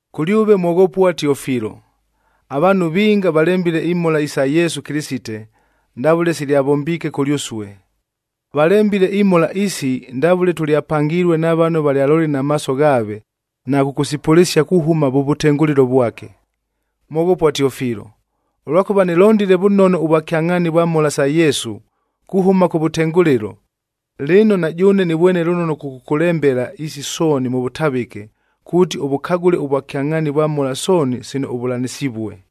Kʉlyʉve mwoghopua Tiofilo: Avaanhu vinga valembile imhola isa Yesu Kɨlɨsite,a ndavʉle silyavombiike kʉlyʉsue. Valembile imhola isi ndavʉle tʉlyapangilue na vano valyalolile na maaso ghaave, na kʉkʉsipʉlɨsia kuhʉma vʉ vʉtengʉlɨlo vwake. Mwoghopua Tiofilo, ʉlwakʉva nɨlondile vʉnono ʉvwakyangʼhaani vwa mhola sa Yesu kuhʉma kʉvʉtengʉlɨlo, lɨno na jʉʉne nɨvwene lʉnono kʉkʉkʉlembela isi sooni mʉ vʉtavɨke, kuuti ʉvʉkagʉle ʉvwakyangʼhaani vwa mhola sooni sino ʉvʉlanɨsivue.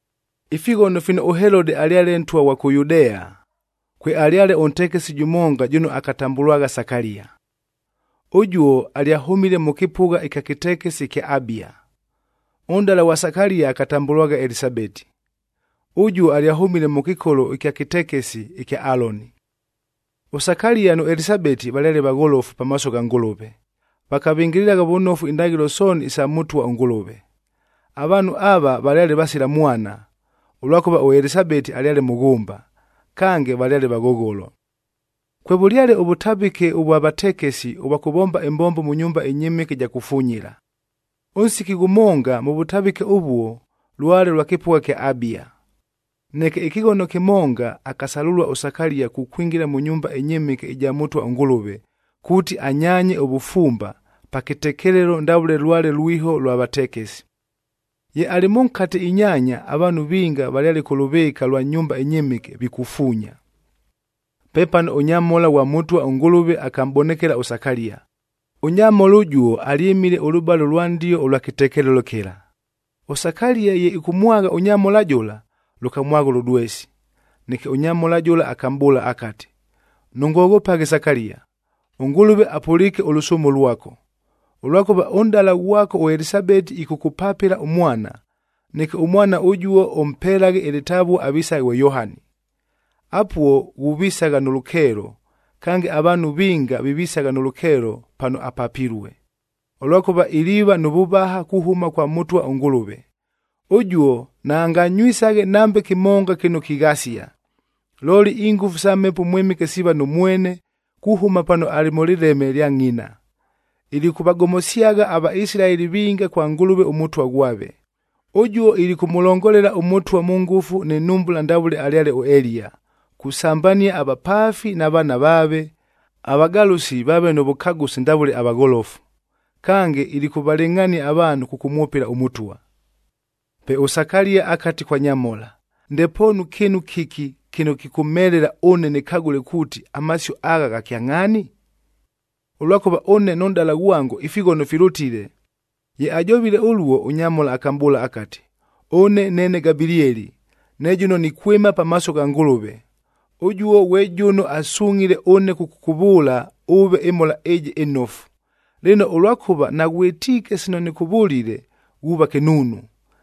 Ifighono fino ʉHelode alyale ntwa ghwa kʉ Yudea, kwealyale ʉntekesib jʉmonga jʉno akatambʉlwagha Sakalia. Ʉjuo alyahʉmile mʉ kɨpʉgha ɨkya kɨtekesi ɨkya Abia. Ʉnʼdala ghwa Sakalia akatambʉlwagha Elisabeti. Ʉjuo alyahʉmile mʉ kɨkolo ɨkya kɨtekesi ɨkya Aloni. ɄSakalia nʉ Elisabeti valyale vagholofu pamaaso gha Ngʉlʉve, vakavɨngɨlɨlagha vʉnofu indaghɨlo sooni isa Mʉtwa ʉNgʉlʉve. Avaanhu ava valyale vasila mwana, ʉlwakʉva ʉElisabeti alyale mʉghʉmba, kange valyale vaghogholo. Kwevʉlyale ʉvʉtavɨke ʉvwa vatekesi ʉvwa kʉvomba ɨmbombo mʉ nyumba ɨnyɨmɨke ɨja kufunyila.c Ʉnsiki ghʉmonga, mʉ vʉtavɨke ʉvuo lwale lwa kɨpʉgha kya Abia. Neke ɨkɨghono kɨmonga, akasalʉlua ʉSakalia kukwingila mʉ nyumba ɨnyɨmɨke ɨja Mʉtwa ʉNgʉlʉve, kuuti anyaanye ʉvʉfumba,d pa kɨtekelelo ndavʉle lwale lwiho lwa vatekesi. Ye alɨ mʉnkate inyaanya, avaanhu vinga valyale kʉ lʉvɨɨka lwa nyumba ɨnyɨmɨke vikufuunya. Pepano ʉnyamhola ghwa Mʉtwa ʉNgʉlʉve akamʼbonekela ʉSakalia. Ʉnyamhola ʉjuo alyɨmile ʉlʉbale ʉlwa ndio ʉlwa kɨtekelelo kɨla. ɄSakalia ye ɨkʉmwagha ʉnyamhola jʉla, lʉkamwagha ʉlʉdwesi. Neke ʉnyamhola jʉla akamʼbʉʉla akati, “Nʉngoghopaghe Sakalia, ʉNgʉlʉve apʉliike ʉlʉsʉʉmo lwako, ʉlwakʉva ʉnʼdala ghwako ʉElisabeti ɨkʉkʉpapɨla ʉmwana, neke ʉmwana ʉjuo ʉmpelaghe ɨlɨtavua avisaghe ghwe Yohani. Apuo ghuvisagha nʉ lʉkeelo, kange avaanhu vinga vivisagha nʉ lʉkeelo pano apapilue, ʉlwakʉva iliiva nʉ vʉvaha kuhʉma kwa Mʉtwa ʉNgʉlʉve. Ʉjuo naanganywisaghe nambe kɨmonga kɨno kighasia, looli ingʉfu isa Mhepo ʉMwɨmɨke siiva nʉ mwene kuhʉma pano alɨ mʉ lɨleme lya ngʼina. Ilikʉvagomosyagha aVaisilaeli vinga kwa Ngʉlʉve ʉMʉtwa ghwave. Ʉjuo ilikʉmʉlongolela ʉMʉtwa mʉ ngʉfu nɨ nhumbula ndavʉle alyale ʉEliya,e kusambania avapaafi na vaana vaave, avagalʉsi vaave nʉ vʉkagʉsi ndavʉle avagholofu. Kange, ilikʉvalɨngʼhania avaanhu kʉkʉmwʉpɨla ʉMʉtwa.” Pe ʉSakalia akati kwa nyamhola, “Ndepoonu kɨɨnu kɨki kɨno kɨkʉmhelela ʉne nɨkagʉle kuuti, amasio agha gha kyangʼhaani? Ʉlwakʉva ʉne nʉ nʼdala ghwango ifighono filʉtile.” Ye ajovile ʉluo, ʉnyamhola akamʼbʉʉla akati, “Ʉne neene Gabilieli, ne jʉno nikwɨma pamaaso gha Ngʉlʉve, ʉjuo ghwe jʉno asungʼhile ʉne kʉkʉkʉvʉʉla ʉve ɨmhola ɨjɨ ɨnofu. Lɨno, ʉlwakʉva naghwɨtiike sino nɨkʉvʉlile, ghuuva kɨnuunu.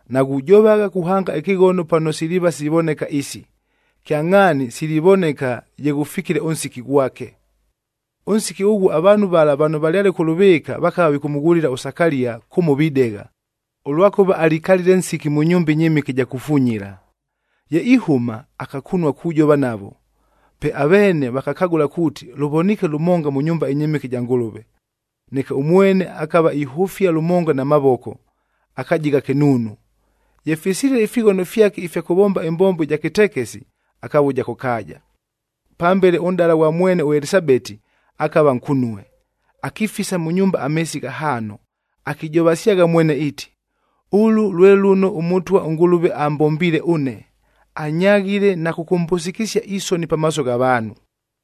Naghujovagha kuhanga ɨkɨghono pano siliiva sivoneka isi, kyangʼhaani silivoneka ye ghʉfikile ʉnsiki ghwake!” Ʉnsiki ʉghuo avaanhu vala vano valyale kʉ lʉvɨɨka, vakava vikʉmʉghulila ʉSakalia kʉmo videgha, ʉlwakʉva alikalile nsiki mʉ nyumba ɨnyɨmɨke ɨja kufunyila. Ye ihʉma, akakunua kujova navo, pe aveene vakakagʉla kuuti, lʉvoniike lʉmonga mʉ nyumba ɨnyɨmɨke ɨja Ngʉlʉve. Neke ʉmwene akava ihʉfia lʉmonga na mavoko, akajigha kɨnuunu. Ye fisilile ifighono fyake ifya kʉvomba ɨmbombo ɨja kɨtekesi, akavuja kʉ kaaja. Pambele ʉnʼdala ghwa mwene ʉElisabeti, akava nkunue, akifisa mʉ nyumba ameesi ghahaano. Akijovasyagha mwene iiti, “Ʉlʉ lwe lʉno ʉMʉtwa ʉNgʉlʉve ambombiile ʉne, anyaghile na kʉkʉmbʉsɨkɨsia isoni pamaaso gha vaanhu.”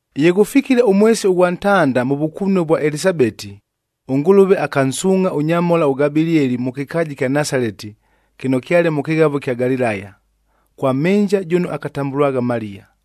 Ye ghʉfikile ʉmwesi ʉghwa ntanda mʉ vʉkunue vwa Elisabeti, ʉNgʉlʉve akansuungʼha ʉnyamhola ʉGabilieli mʉ kɨkaaja ɨkya Nasaleti, kɨno kyale mʉ kɨghavo ɨkya Galilaya, kwa mhɨnja jʉno akatambʉlwagha Maliya.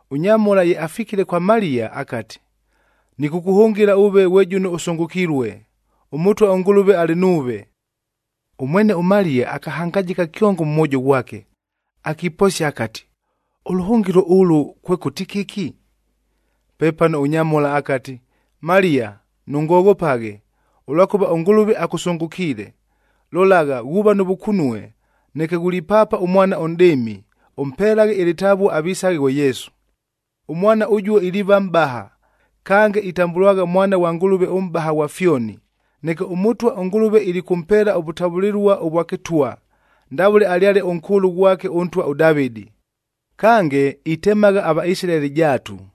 Ʉnyamhola ye afikile kwa Maliya, akati, “Nɨkʉkʉhʉngɨla ʉve ghwe jʉno ʉsʉngʉkilue, ʉMʉtwa ʉNgʉlʉve alɨ nuuve.” Ʉmwene ʉMaliya akahangajɨka kyongo mʉ mwojo ghwake, akiposia akati, “Ʉlʉhʉngɨlo ʉlʉ, kwekʉti kɨki!” Pepano ʉnyamhola akati, “Maliya, nʉngoghopaghe, ʉlwakʉva ʉNgʉlʉve akʉsʉngʉkiile. Lolagha, ghuuva nʉ vʉkunue, neke ghulipaapa ʉmwana ʉnʼdɨɨmi, ʉmpelaghe ɨlɨtavua avisaghe ghwe Yesu. Ʉmwana ʉjuo iliiva mʼbaha, kange itambʉlwagha Mwana ghwa Ngʉlʉve ʉMʼbaha ghwa fyoni. Neke ʉMʉtwa ʉNgʉlʉve ilikʉmpeela ʉvʉtavʉlɨlua ʉvwa kɨtwa, ndavʉle alyale ʉnkʉʉlʉ ghwake ʉntwa ʉDavɨdi. Kange, itemagha aVaisilaeli jaatu,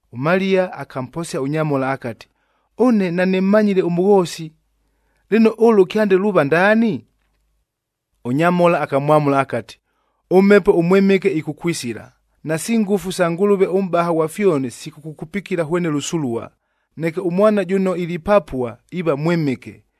ɄMaliya akamposia ʉnyamhola akati, “Ʉne nanɨmmanyile ʉmʉghoosi, lɨno ʉlʉ kyande luuva ndaani?” Ʉnyamhola akamwamʉla akati, “ɄMhepo ʉMwɨmɨke ɨkʉkwisila, nasi ngʉfu sa Ngʉlʉve ʉMʼbaha ghwa fyoni sikʉkʉkupikila hwene lʉsulua, neke ʉmwana jʉno ilipapua iiva Mwɨmɨke,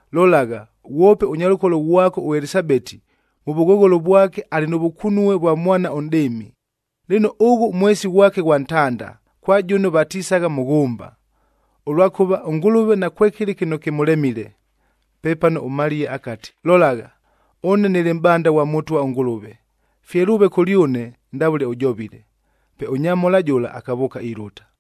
Lolagha, ghwope ʉnyalʉkolo ghwako ʉElisabeti mʉ vʉghogholo vwake alɨ nʉ vʉkunue vwa mwana ʉnʼdɨɨmi. Lɨno, ʉghʉ mwesi ghwake ghwa ntanda, kwa jʉno vatisagha mʉghʉmba! Ʉlwakʉva ʉNgʉlʉve nakwekɨlɨ kɨno kɨmʉlemile.” Pepano ʉMaliya akati, “Lolagha, ʉne nɨlɨ mʼbanda ghwa Mʉtwa ʉNgʉlʉve, fye lʉʉve kʉlyʉne ndavʉle ʉjovile.” Pe ʉnyamhola jʉla akavʉʉka ilʉta.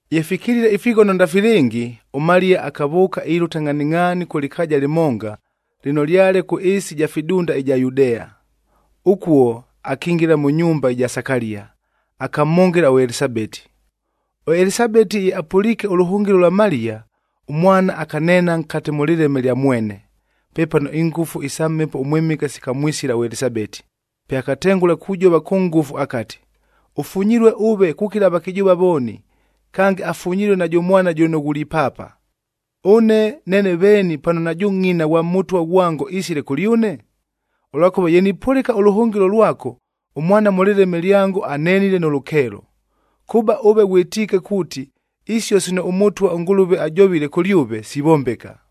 Ye fikilile ifighono ndafilɨngi, ʉMaliya akavʉʉka ilʉta ngʼhaningʼhaani kʉ lɨkaaja lɨmonga, lɨno lyale kʉ ɨɨsi ɨja fidunda ɨja Yudea. Ʉkuo akingila mʉ nyumba ɨja Sakalia, akamhʉngɨla ʉElisabeti. ɄElisabeti ye apʉliike ʉlʉhʉngɨlo lwa Maliya, ʉmwana akaneena nkate mʉ lɨleme lya mwene. Pepano ingʉfu isa Mhepo ʉMwɨmɨke sikamwisila ʉElisabeti, pe akatengʉla kujova kʉ ngʉfu akati, “Ʉfunyilue ʉve kukila avakɨjʉʉva vooni, kange afunyilue najʉ mwana jʉno ghulipaapa. Ʉne neene veeni pano najʉ ngʼina ghwa Mʉtwa ghwango isile kʉlyʉne? Ʉlwakʉva ye nipʉlɨka ʉlʉhʉngɨlo lwako, ʉmwana mʉ lɨleme lyango, anenile nʉ lʉkeelo. Kʉba ʉve ghwɨtiike kuuti, isio sino ʉMʉtwa ʉNgʉlʉve ajovile kʉlyʉve, sivombeka.”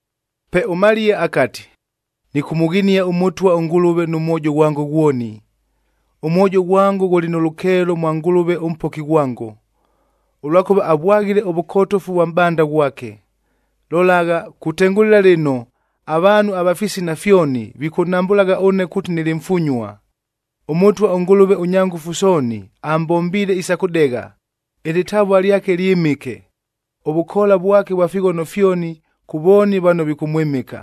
Pe ʉMaliya akati, “Nɨkʉmʉghinia ʉMʉtwa ʉNgʉlʉve, nʉ mwojo ghwango ghwoni. Ʉmwojo ghwango ghʉlɨ nʉ lʉkeelo mwa Ngʉlʉve ʉMpoki ghwango. Ʉlwakʉva avwaghile ʉvʉkotofu vwa mʼbanda ghwake. Lolagha, kutengʉlɨla lɨno avaanhu ava fisina fyoni, vikʉnhambʉlagha ʉne kuuti nɨlɨ mfunyua. ɄMʉtwa ʉNgʉlʉve ʉnya ngʉfu sooni ambombiile isa kʉdegha, ɨlɨtavua lyake lyɨmɨke. Ʉvʉkoola vwake vwa fighono fyoni, kʉ vooni vano vikʉmwɨmɨka.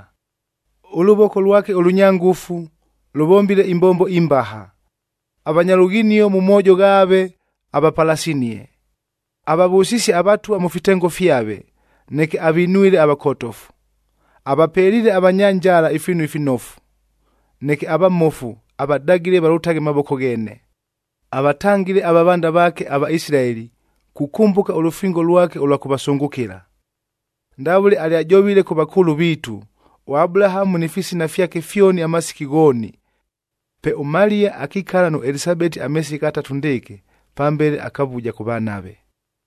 Ʉlʉvoko lwake ʉlʉnya ngʉfu, lʉvombile imbombo imbaha, avanya lughinio mʉ moojo ghaave, avapalasinie. Avavʉsisie avatwa mʉ fitengo fyave, neke avinwile avakotofu. Avapeliile avanya njala ifiinu ifinofu, neke avamofu avadagile valʉtaghe mavoko gheene. Avatangile avavanda vaake aVaisilaeli, kukʉmbʉka ʉlʉfingo lwake ʉlwa kʉvasʉngʉkɨla, ndavʉle alyajovile kʉ vakʉʉlʉ viitu, ʉAbulahamu ni fisina fyake fyoni amasiki ghooni.” Pe ʉMaliya akikala nʉ Elisabeti ameesi ghatatu ndɨɨkɨ, pambele akavuja kʉvanave.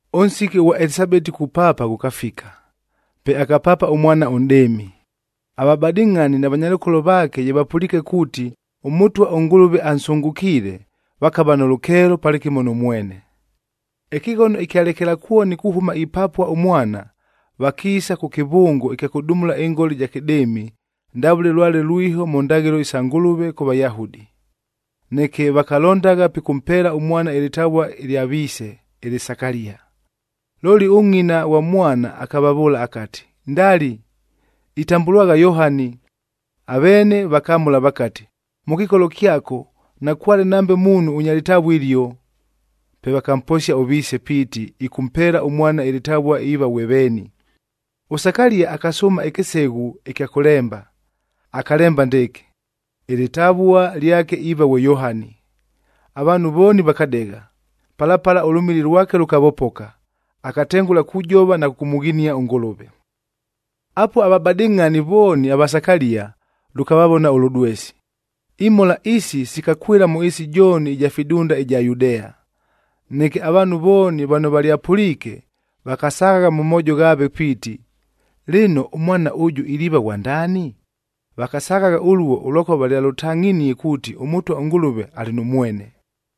Ʉnsiki ʉghwa Elisabeti kupaapa ghʉkafika, pe akapaapa ʉmwana ʉnʼdɨɨmi. Avabadɨngʼhani na vanyalʉkolo vaake ye vapʉliike kuuti, ʉMʉtwa ʉNgʉlʉve ansʉngʉkiile, vakava nʉ lʉkeelo palɨkɨmo nʉ mwene. Ɨkɨghono ɨkya lekelakwoni kuhʉma ipapua ʉmwana, vakiisa kʉ kɨvʉngo ɨkya kʉdumula ɨngola ɨja kɨdɨɨmi,i ndavʉle lwale lwiho mʉ ndaghɨlo isa Ngʉlʉve kʉ Vayahudi. Neke vakalondagha pikʉmpeela ʉmwana ɨlɨtavua ɨlya viise, ɨlɨ Sakalia. Looli ʉngʼina ghwa mwana akavavʉʉla akati, “Ndali! Itambʉlwagha Yohani.” Aveene vakamʉla vakati, “Mʉ kɨkolo kyako nakwale nambe muunhu ʉnya lɨtavua ɨlio.” Pe vakamposia ʉviise piiti ɨkʉmpeela ʉmwana ɨlɨtavua iiva ghwe veeni. ɄSakalia akasʉʉma ɨkɨseghu ɨkya kʉlemba, akalemba ndɨɨkɨ, “Ɨlɨtavua lyake iiva ghwe Yohani.” Avaanhu vooni vakadegha. Pala pala ʉlʉmili lwake lʉkavopoka, akatengʉla kujova na kʉkʉmʉghinia ʉNgʉlʉve. Apuo avabadɨngʼhani vooni ava Sakalia, lʉkavavona ʉlʉdwesi. Imhola isi sikakwɨla mʉ ɨɨsi jooni ɨja fidunda ɨja Yudea. Neke avaanhu vooni vano valyapʉliike, vakasaghagha mʉ moojo ghaave piiti, “Lɨno, ʉmwana ʉjʉ iliiva ghwa ndaani?” Vakasaghagha ʉluo, ʉlwakʉva valyalʉtangʼhinie kuuti ʉMʉtwa ʉNgʉlʉve alɨ nʉ mwene.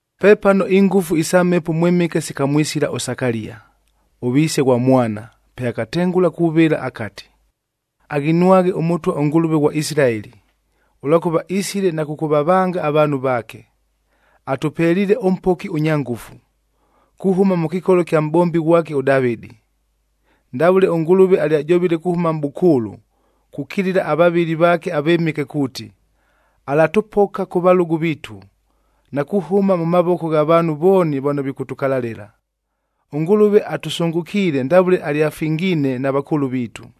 Pepano ingʉfu isa Mhepo ʉMwɨmɨke sikamwisila ʉSakalia, ʉviise ghwa mwana, pe akatengʉla kuvɨla akati, “Aghinwaghe ʉMʉtwa ʉNgʉlʉve ghwa Isilaeli, ʉlwakʉva isile na kʉkʉvavanga avaanhu vaake. Atʉpeliile ʉMpoki ʉnya ngʉfu,j kuhʉma mʉ kɨkolo kya mʼbombi ghwake ʉDavɨdi. Ndavʉle ʉNgʉlʉve alyajovile kuhʉma mʼbʉkʉʉlʉ, kukilila avavɨli vaake avɨmɨke kuuti, alatʉpoka kʉ valʉgʉ viitu, na kuhʉma mʉ mavoko gha vaanhu vooni vano vikʉtʉkalalɨla. ɄNgʉlʉve atʉsʉngʉkiile ndavʉle alyafingiinek na vakʉʉlʉ viitu,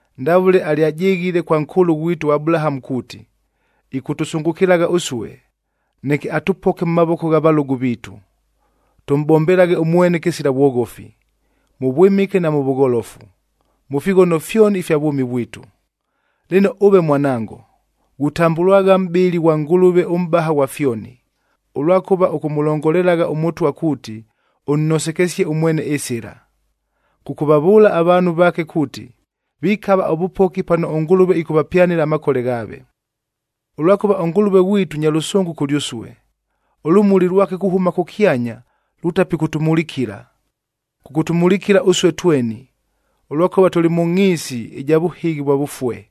Ndavʉle alyajɨghile kwa nkʉʉlʉ ghwitu ʉAbulahamu kuuti, ɨkʉtʉsʉngʉkɨlagha ʉsue, neke atʉpoke mʉ mavoko gha valʉgʉ viitu, tʉmʼbombelaghe ʉmwene kɨsila vwoghofi, mʉ vwɨmɨke na mʉ vʉgholofu, mʉ fighono fyoni ifya vwʉmi vwitu. Lɨno ʉve mwanango, ghutambʉlwagha mʼbɨli ghwa Ngʉlʉve ʉMʼbaha ghwa fyoni, ʉlwakʉva ʉkʉmʉlongolelagha ʉMʉtwa kuuti, ʉnnosekesyaghe ʉmwene ɨsɨla, kʉkʉvavʉʉla avaanhu vaake kuuti, vikava ʉvʉpoki pano ʉNgʉlʉve ɨkʉvapyanɨla amakole ghaave. Ʉlwakʉva ʉNgʉlʉve ghwitu nya lʉsʉngʉ kʉlyʉsue, ʉlʉmuli lwake kuhʉma kʉkyanya, lutapɨkʉtʉmulikila, kʉkʉtʉmulikila ʉsue tweni, ʉlwakʉva tʉlɨ mʉ ngʼhiisi ɨja vʉhɨghi vwa vʉfue,m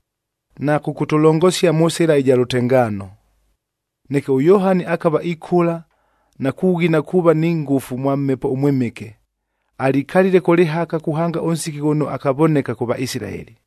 na kʉkʉtʉlongosia mʉ sɨla ɨja lʉtengaano.” Neke ʉYohani akava ikʉla, na kughina kuuva ni ngʉfu mwa Mhepo ʉMwɨmɨke. Alikalile kʉ lɨhaka kuhanga ʉnsiki ghʉno akavoneka kʉ Vaisilaeli.